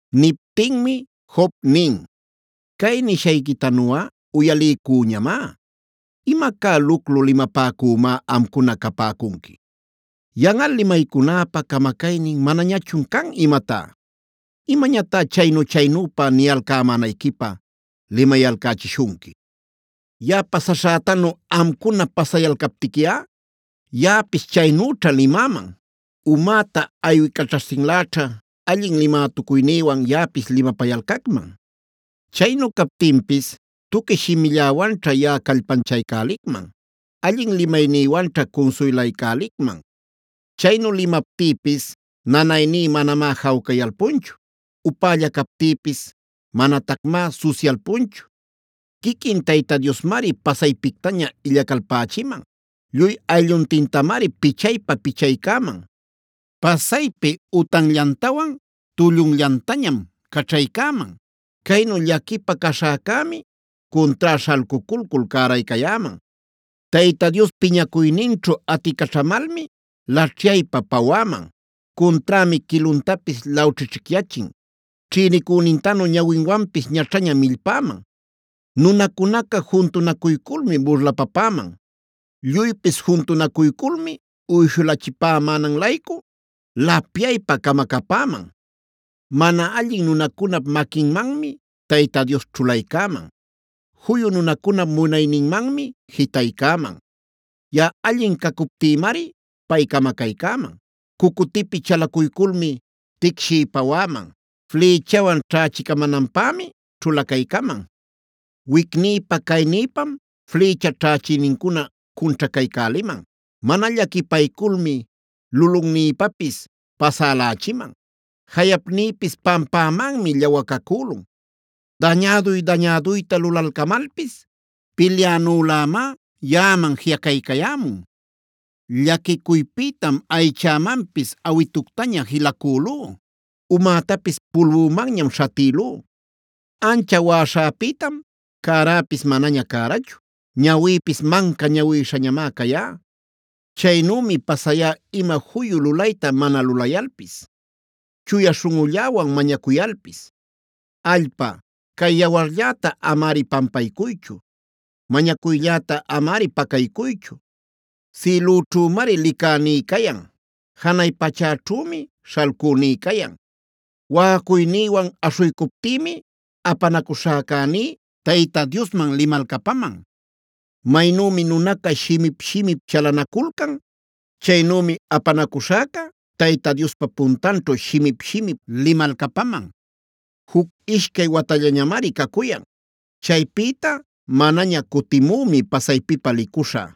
Niptinmi Job nin: “Cay nishayquitanuꞌa uyaliycüñamá. ¡Imacá luclu limapäcümá amcuna capäcunqui! ¿¡Yanꞌal limaycunäpa camacaynin manañachun can imatá!? ¿Imañatá chaynu-chaynüpa niyalcämänayquipä limayalcächishunqui? Yaꞌa pasaśhätanu amcuna pasayalcaptiquiꞌa yaꞌapis chaynüćha limäman. Umäta aywicaćhaśhtinläćha allin limätucuynïwan yaꞌapis limapayalcacman. Chaynu captinpis tuqui shimilläwanćha yaꞌa callpanchaycälicman; allin limaynïwanćha cunsuylaycälicman. “Chaynu limaptïpis nanayní manamá jawcayalpunchu; upälla captïpis manatacmá susyalpunchu. Quiquin Tayta Diosmari pasaypictaña illacalpächiman; lluy aylluntintamari pichaypa-pichaycäman. Pasaypi utanllantawan tullunllantañam caćhaycäman; caynu llaquipä caśhäcämi, cuntrá śhalculcul cäraycayäman. Tayta Dios piñacuyninćhu aticaćhamalmi, laćhyaypä-pawäman; cunträmi quiluntapis lawćhićhicyachin. Ćhïnicünintanümi ñawinwanpis ñaćhaña millpäman. Nunacunaca juntunacuyculmi burlapapäman; lluypis juntunacuyculmi uyshulächipämänan-laycu, lapyaypa camacapäman. Mana allin nunacunap maquinmanmi Tayta Dios ćhulaycäman; juyu nunacunap munayninmanmi jitaycäman. Yaꞌa allin cacuptïmari pay camacaycäman, cucutïpi chalacuyculmi ticshiy-pawäman, flïchawan ćhächicamänanpämi ćhulacaycaman. Wicnïpa caynïpam flïcha ćhächïnincuna cunćhacaycäliman. Mana llaquipayculmi lulunnïpapis pasälächiman, jayapnïpis pampämanmi llawacacülun. Dañäduy-dañäduyta lulalcamalpis pilyänülämá yaꞌaman jiꞌacaycayämun. “Llaquicuypïtam aychämanpis awituctaña jilacülú. Umätapis pulbümanñam śhatïlú. Ancha waꞌaśhäpïtam cäräpis manaña cärachu; ñawïpis manca ñawïshañamá cayan. Chaynümi pasayá ima juyu lulayta mana lulayalpis, chuya śhunꞌulläwan mañacuyalpis. “Allpa, cay yawarlläta amari pampaycuychu; mañacuylläta amari pacaycuychu. Sïlüćhümari licäní cayan; janay pachäćhümi śhalcüní cayan. Waꞌacuynïwan aśhuycuptïmi, apanacuśhäcäní Tayta Diosman limalcapaman. Maynümi nunaca shimip-shimip chalanaculcan, chaynümi apanacushäca Tayta Diospa puntanćhu shimip-shimip limalcapaman. Juc ishcay watallañamari cacuyan; chaypïta manaña cutimümi pasaypipä licuśhä.